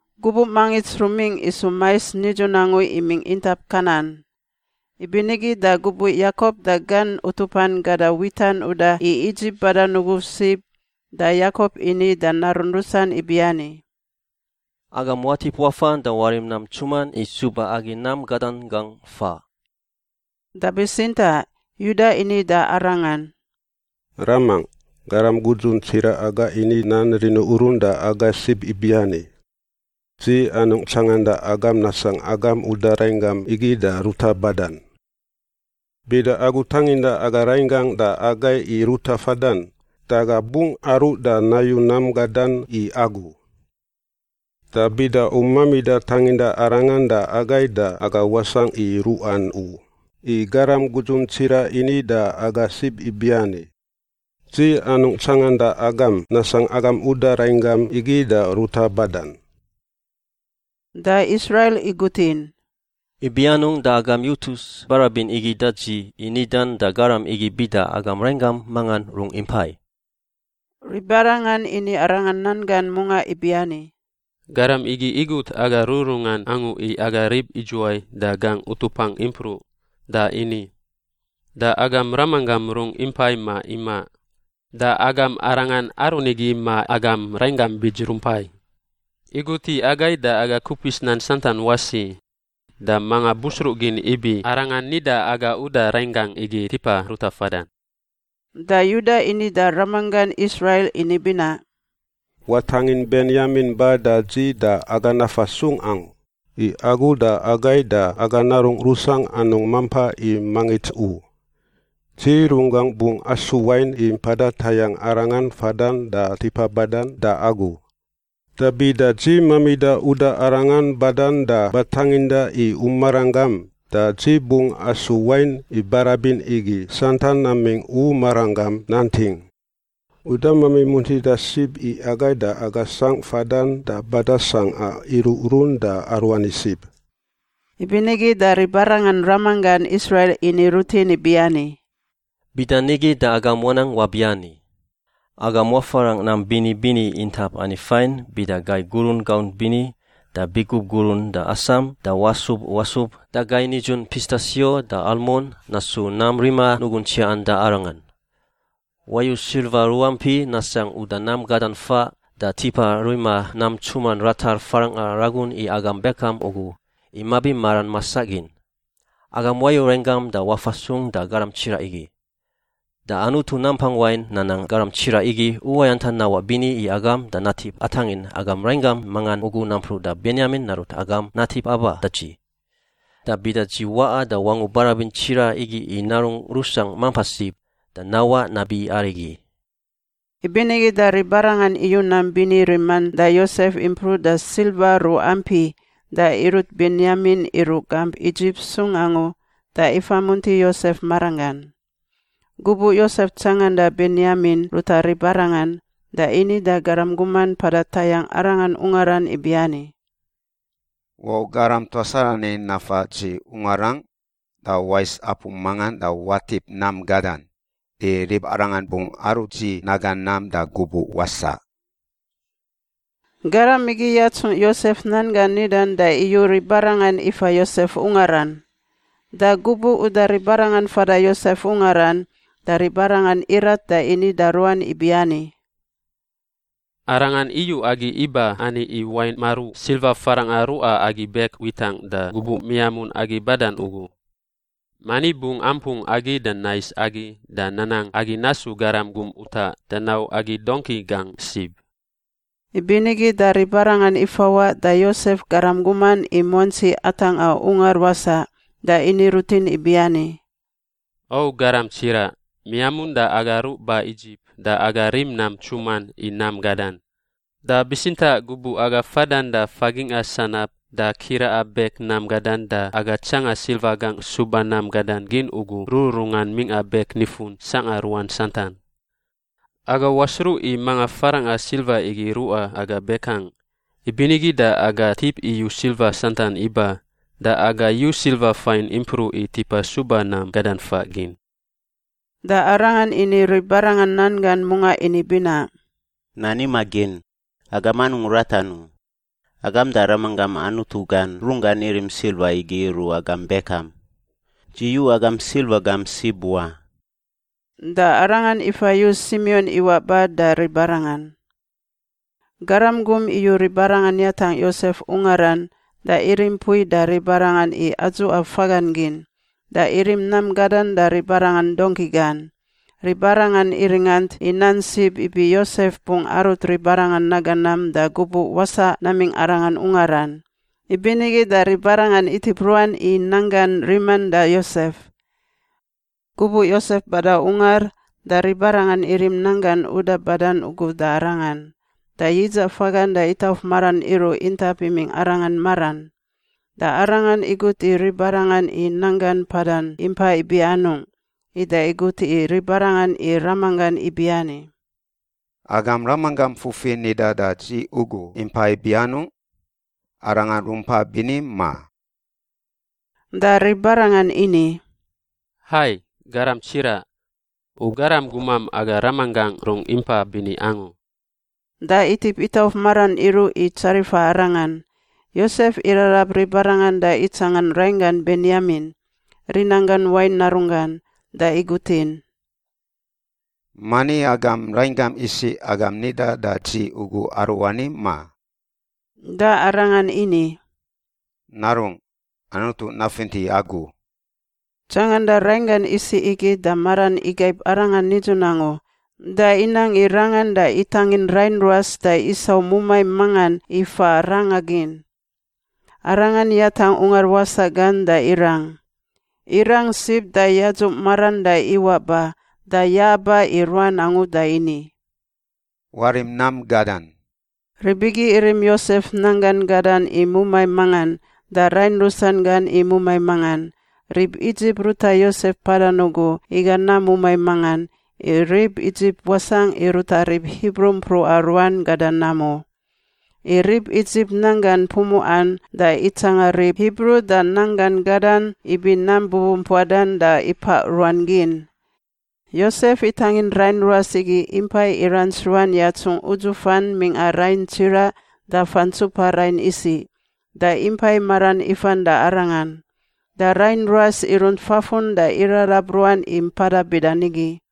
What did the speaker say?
Gubuꞌ mangits rumingꞌ isu mais nidzun angu imingꞌ intap Kanan. Ibinigi da gubuꞌ Yakop da gan utupan gada witan uda i Idzip badan ugu sib, da Yakop ini da narun rusan ibiani, “Agam watip wafan da warim nam ntsuman i suba agi nam gadan gangꞌ faꞌ.” Da bitsintaꞌ Yuda ini da arangan, “Ramangꞌ. Garam gudzun tsiraꞌ aga ini nan riniurun da aga sib ibiani, ‘Dzi anungꞌ tsanganda agam nasangꞌ agam uda rainggam igi da ruta badan.’ Bida agu tanginda aga rainggangꞌ da agai i ruta fadan, da aga bungꞌ aruꞌ da nayu nam gadan i agu. Da bida u mamida tanginda arangan da agai da aga wasangꞌ i ruꞌan u, i garam gudzun tsiraꞌ ini da aga sib ibiani, ‘Dzi anungꞌ tsanganda agam nasangꞌ agam uda rainggam igi da ruta badan.’” Da Israil igutin, “Ibi anungꞌ da agam yutus barabin igi da dzi i nidan da garam igi bida agam rainggam mangan rungꞌ impai?” Ribarangan ini arangan nan gan mungaꞌ ibiani, “Garam igi igut aga rururungan angu i aga rib idzuwai da gangꞌ utupangꞌ impruꞌ, da ini, ‘Da agam ramanggam rungꞌ impai ma imaꞌ? Da agam arangan aru nigi ma agam rainggam bits rumpai?’ Igut i agai da aga kupis nan santan wasi. Da manga busruꞌgin ibi arangan nida aga uda rainggangꞌ igi tipa ruta fadan?” Da Yuda ini da ramanggan Israil ini binaꞌ, “Watangin Benyamin ba da dzi da aga nafa sung angu, i agu da agai da aga narungꞌ rusangꞌ anungꞌ mampa i mangits u. Dzi runggangꞌ bungꞌ asu wain i mpada tayangꞌ arangan fadan da tipa badan da agu. Da bida dzi mamida uda arangan badan da batanginda i u maranggam, da dzi bungꞌ asu wain i barabin igi santan namingꞌ u maranggam nanting. U damami muntida sib i agai da aga sangꞌ fadan da badan sangꞌa iruꞌrun da aruani sib.” Ibinigi da ribarangan ramanggan Israil ini rutin ibiani, “Bidanigi da agam wanang wabiani: agam wafarangꞌ nam bini bini intap ani fain bida gai gurun gaunt bini da bigub gurun da asam da wasub wasub da gai nidzun pistasio da almon— nasu nam rima nugun tsiaꞌan da arangan. Wayu silva ruampi nasangꞌ uda nam gadan faꞌ da tipa rima nam ntsuman ratar farangꞌa ragun i agam bekam ugu, i mabi maran masaꞌ gin. Agam wau rainggam da wafa sung da garam tsiraꞌ igi. Da Anutu Nampang Wain nanang garam tsiraꞌ igi uwayantan nawaꞌ bini i agam da natip atangin agam rainggam mangan ugu nampruꞌ da Benyamin narut agam natip aba da dzi. Da bida dzi waꞌa da wangu barabin tsiraꞌ igi i narungꞌ rusangꞌ mampa sib, da nawaꞌ nabi arigi.” Ibinigi da ribarangan iyu nam bini riman da Yosef impruꞌ da silva ruampi da irut Benyamin iruꞌ gamp Idzip sung angu da ifamunti Yosef maranggan. Gubuꞌ Yosef tsanganda Benyamin ruta ribarangan, da ini da garam guman mpada tayangꞌ arangan ungaran ibiani, “Wau garam tuas arani nafa dzi ungarangꞌ da wais apu mangan da watip nam gadan. I ribarangan bungꞌ arut dzi naga nam da gubuꞌ wasaꞌ.” Garam igi yatsung Yosef nan gan nidan da iyu ribarangan ifa Yosef ungaran. Da gubuꞌ uda ribarangan fada Yosef ungaran, da ribarangan irat da ini da ruan ibiani, “Arangan iyu agi iba ani i wain maruꞌ silva farangꞌa ruꞌa agi bek witangꞌ da gubuꞌ miamun agi badan ugu. Mani bungꞌ ampung agi da nais agi da nanang agi nasu garam gum utaꞌ da nau agi dongki gangꞌ sib.” Ibinigi da ribarangan ifawaꞌ da Yosef garam guman i muantsi atangꞌa ungar wasaꞌ da ini rutin ibiani, “O garam tsiraꞌ, miamun da aga ruꞌ ba Idzip da aga rim nam ntsuman i nam gadan. Da bitsintaꞌ gubuꞌ aga fadan da fagingꞌa sanab da kiraꞌa bek nam gadan da aga tsanga silva gangꞌ suba nam gadan gin ugu rururungan mingꞌa bek nifun sangꞌa ruan santan. Aga wasruꞌ i manga farangꞌa silva igi ruꞌa aga bekangꞌ. Ibinigi da aga tip iyu silva santan iba. Da aga yu silva fain impruꞌ i tipa suba nam gadan faꞌ gin.” Da arangan ini ribarangan nan gan mungaꞌ ini binaꞌ, “Nan imaꞌ gin. Agam anungꞌ ratan u. Agam da ramanggam Anutu gan runggan irim silva igi iruꞌ agam bekam. Dzi yu agam silva gam sib wa.” Da arangan ifa yu Simion iwaꞌ ba da ribarangan. Garam gum iyu ribarangan yatangꞌ Yosef ungaran da irim mpui da ribarangan i adzuꞌa fagan gin, da irim nam gadan da ribarangan dongki gan. Ribarangan iringant i nan sib ibi Yosef bungꞌ arut ribarangan naga nam da gubuꞌ wasaꞌ namingꞌ arangan ungaran, ibinigi da ribarangan itip ruan i nanggan riman da Yosef. Gubuꞌ Yosef bada ungar, da ribarangan irim nanggan uda badan ugu da arangan, da yidzaꞌ fagan da itauf maran iruꞌ intap imingꞌ arangan maran. Da arangan igut i ribarangan i nanggan mpadan impa ibi anungꞌ ida igut i ribarangan i ramanggan ibiani, “Agam ramanggam fufi nida da dzi ugu impa ibi anungꞌ? Arangan rumpai bini, ma?” Da ribarangan ini, “Hai, garam tsiraꞌ. U garam gumam aga ramanggangꞌ rungꞌ impa bini angu.” Da itip itauf maran iruꞌ i tsarifa arangan. Yosef irarab ribarangan da itsangan rainggan Benyamin, rinanggan wain narunggan, da igutin, “Mani agam rainggam isiꞌ agam nida da dzi ugu aruani, ma?” Da arangan ini, “Narungꞌ, Anutu nafinti agu.” Tsanganda rainggan isiꞌ igi da maran igaib arangan nidzun angu da inang i rangan, da itangin rain ruas da isau mumai mangan i fa ranga gin. Arangan yatangꞌ ungar wasaꞌ gan da irang. Irang sib da yadzuꞌ maran da iwaꞌ ba da ya-aba i ruan angu da ini, “Warim nam gadan.” Rib igi irim Yosef nanggan gadan i mumai mangan da rain rusan gan i mumai mangan. Rib Idzip ruta Yosef mpadan ugu iga nam mumai mangan, i rib Idzip wasangꞌ i ruta rib Hibru mpruꞌa ruan gada nam u. I rib Idzip nanggan pumuꞌan da itsanga rib Hibru da nanggan gadan ibi nam bubumpuadan da ipaꞌ ruan gin. Yosef itangin rain ruas igi impai irants ruan yatsungꞌ udzufan mingꞌa rain tsiraꞌ da fantsupa rain isiꞌ, da impai maran ifan da arangan. Da rain ruas irunt fafun da irarab ruan i mpada bida nigi.